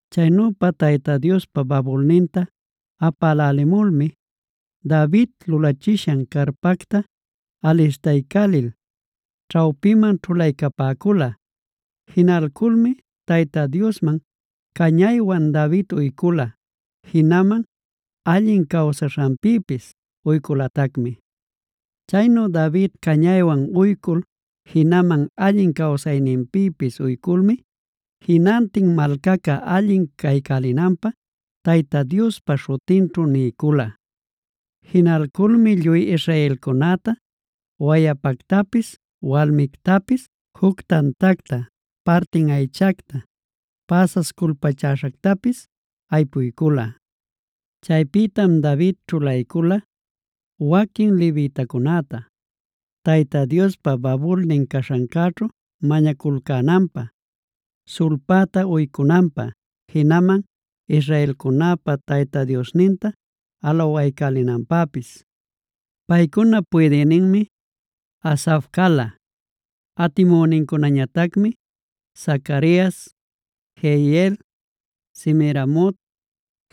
Chaynüpa Tayta Diospa babulninta apalcälimulmi, David lulachishan carpacta alistaycälil ćhawpinman ćhulaycapäcula. Jinalculmi Tayta Diosman cañaywan David uycula, jinaman allin cawsaśhanpïpis uyculatacmi. Chaynu David cañaywan uycul jinaman allin cawsaśhanpïpis uyculmi jinantin malcaca allin caycälinanpä Tayta Diospa śhutinćhu niycula. Jinalculmi lluy israelcunäta wayapactapis walmictapis juc tantacta, partin aychacta, päsas culpachäśhactapis aypuycula. Chaypïtam David ćhulaycula waquin levitacunäta Tayta Diospa babulnin caśhancäćhu mañaculcänanpä, sulpäta uycunanpä, jinaman israelcunäpa Tayta Diosninta alawaycälinanpäpis. Paycunap puydïninmi Asaf cala. Atimünincunañatacmi: Zacarias, Jeiel, Semiramot,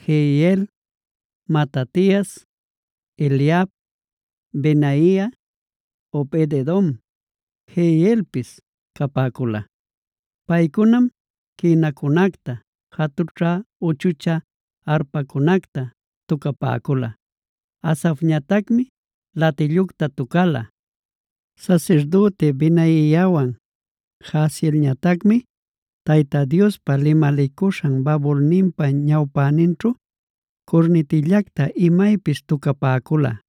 Jehiel, Matatias, Eliab, Benaia, Obed-edom, Jeielpis capäcula. Paycunam quïnacunacta, jatućhä-uchuchä arpacunacta tucapäcula. Asafñatacmi latillucta tucala. Sasirdüti Benaiawan Jahazielñatacmi Tayta Diospa limalicuśhan babulninpa ñawpäninćhu curnitillacta imaypis tucapäcula.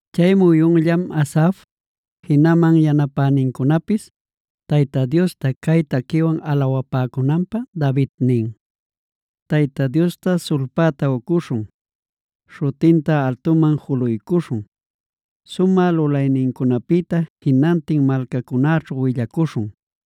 Chay muyunllam Asaf, jinaman yanapänincunapis Tayta Diosta cay taquiwan alawapäcunanpä David nin: “Tayta Diosta sulpäta uycuśhun; śhutinta altuman juluycuśhun. Sumä lulaynincunapïta jinantin malcacunäćhu willacuśhun.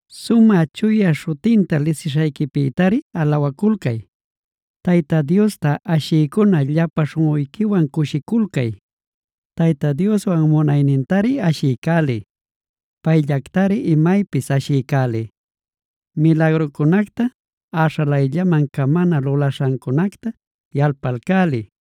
Sumä chuya śhutinta lisishayquipïtari alawaculcay; Tayta Diosta ashïcuna llapan śhunꞌuyquiwan cushiculcay. Tayta Diostawan munaynintari ashiycäliy; payllactari imaypis ashiycäliy. Milagrucunacta, äśhalayllaman camana lulaśhancunacta yalpalcäliy.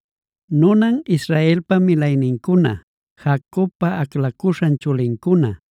nunan Israelpa milaynincuna, Jacobpa aclacuśhan chulincuna.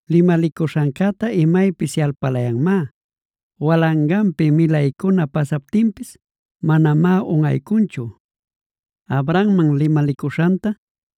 Limalicuśhancäta imaypis yalpalayanmá; walanganpi milaycuna pasaptinpis manamá unꞌaycunchu. Abrahamman limalicuśhanta,a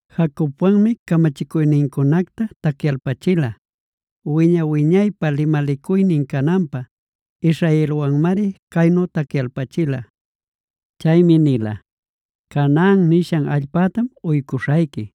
Jacobwanmi camachicuynincunacta tacyalpachila; wiña-wiñaypä limalicuynin cananpä israelwanmari caynu tacyalpachila. Chaymi nila: ‘Canaan nishan allpactam uycuśhayqui;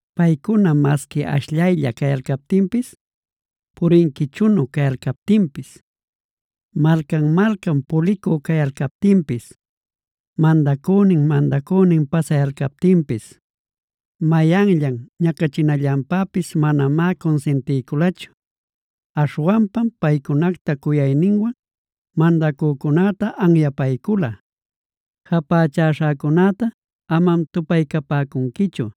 “Paycuna masqui ashllaylla cayalcaptinpis, purinquichunu cayalcaptinpis, malcan-malcan pulicü cayalcaptinpis, mandacünin-mandacünin pasayalcaptinpis, mayanllan ñacachinallantapis manamá cunsintiyculachu. Aśhwanpam paycunacta cuyayninwan mandacücunäta anyapaycula: ‘Japächaśhäcunäta amam tupaycapäcunquichu;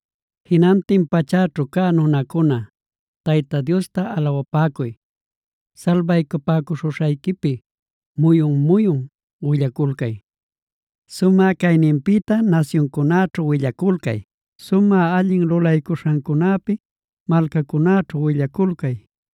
“Jinantin pachäćhu cä nunacuna Tayta Diosta alawapäcuy; salbaycapäcuśhuśhayquipi muyun-muyun willaculcay. Sumä cayninpïta nasyuncunäćhu willaculcay; sumä allin lulaycuśhancunäpi malcacunäćhu willaculcay.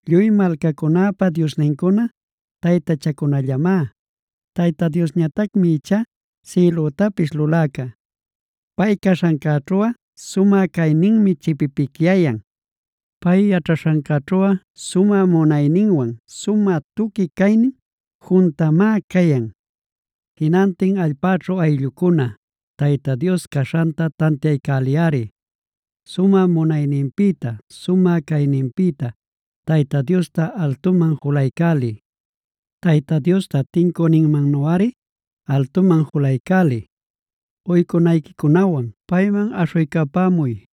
Lluy malcacunäpa diosnincuna taytachacunallamá; Tayta Diosñatacmi ichá sïlütapis luläca. Pay caśhancäćhuꞌa sumä cayninmi chipipicyayan; pay yaćhaśhancäćhuꞌa sumä munayninwan sumä tuqui caynin juntamá cayan. “Jinantin allpäćhu ayllucuna Tayta Dios caśhanta tantiaycäliyꞌari; sumä munayninpïta, sumä cayninpïta Tayta Diosta altuman julaycäliy. Tayta Diosta tincüninmannuꞌari altuman julaycäliy. Uycunayquicunawan payman aśhuycapämuy.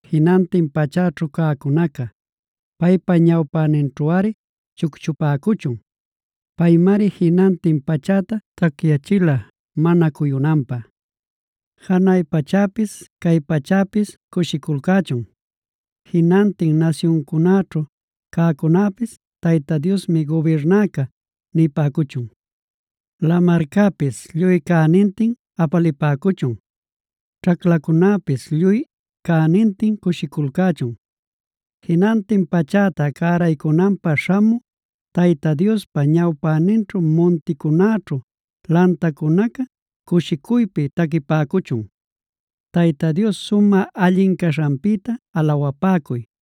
Jinantin pachäćhu cäcunaca paypa ñawpäninćhuꞌari chucchupäcuchun. Paymari jinantin pachäta tacyachila mana cuyunanpä. Janay pachäpis cay pachäpis cushiculcächun. Jinantin nasyuncunäćhu cäcunäpis ‘Tayta Diosmi gubirnäca’ nipäcuchun. Lamarcäpis lluy cänintin apalipäcuchun. Ćhaclacunäpis lluy cänintin cushiculcächun. Jinantin pachäta cäraycunanpä śhamü, Tayta Diospa ñawpäninćhu munticunäćhu, lantacunaca cushicuypi taquipäcuchun. “Tayta Dios sumä allin caśhanpïta alawapäcuy.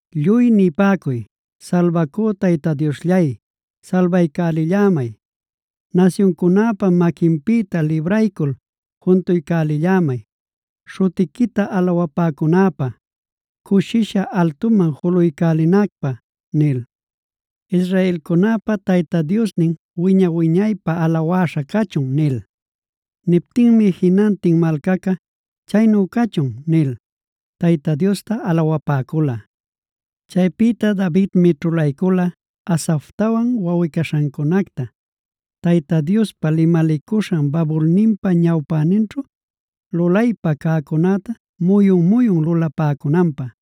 Lluy nipäcuy: ‘Salbacü Tayta Diosllay, salbaycälillämay. Nasyuncunäpa maquinpïta libraycul juntuycälillämay, śhutiquita alawapäcunäpä, cushisha altuman julaycälinacpä’ nil. Israelcunäpa Tayta Diosnin, wiña-wiñaypä alawäśha cachun” nil. Niptinmi jinantin malcaca: “Chaynu cachun” nil Tayta Diosta alawapäcula. Chaypïta Davidmi ćhulaycula Asaftawan wawꞌi-caśhancunacta, Tayta Diospa limalicuśhan babulninpa ñawpäninćhu, lulaypä cäcunäta muyun-muyun lulapäcunanpä.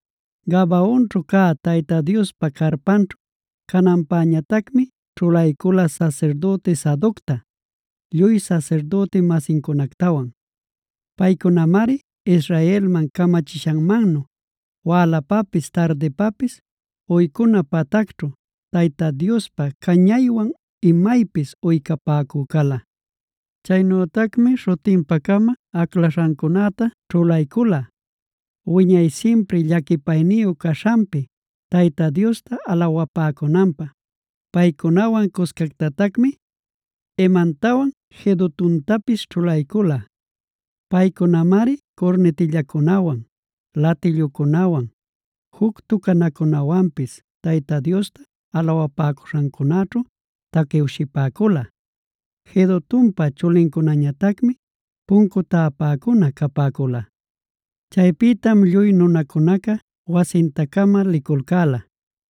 Gabaonćhu cä Tayta Diospa carpanćhu cananpäñatacmi ćhulaycula sasirdüti Sadocta lluy sasirdüti-masincunactawan. Paycunamari Israelman camachishanmannu, wälanpapis tardinpapis uycuna patacćhu, Tayta Diospa cañaywan imaypis uycapäcü cala. Chaynütacmi śhutinpa-cama aclaśhancunäta ćhulaycula, wiñay simpri llaquipayniyu caśhanpi Tayta Diosta alawapäcunanpä. Paycunawan cuscactatacmi Hemantawan Jedutuntapis ćhulaycula. Paycunamari curnitillancunawan, latilluncunawan, juc tucanacunawanpis Tayta Diosta alawapäcuśhancunaćhu taquiwshipäcula. Jedutunpa chulincunañatacmi puncu täpäcuna capäcula. Chaypïtam lluy nunacunaca wasinta-cama liculcäla.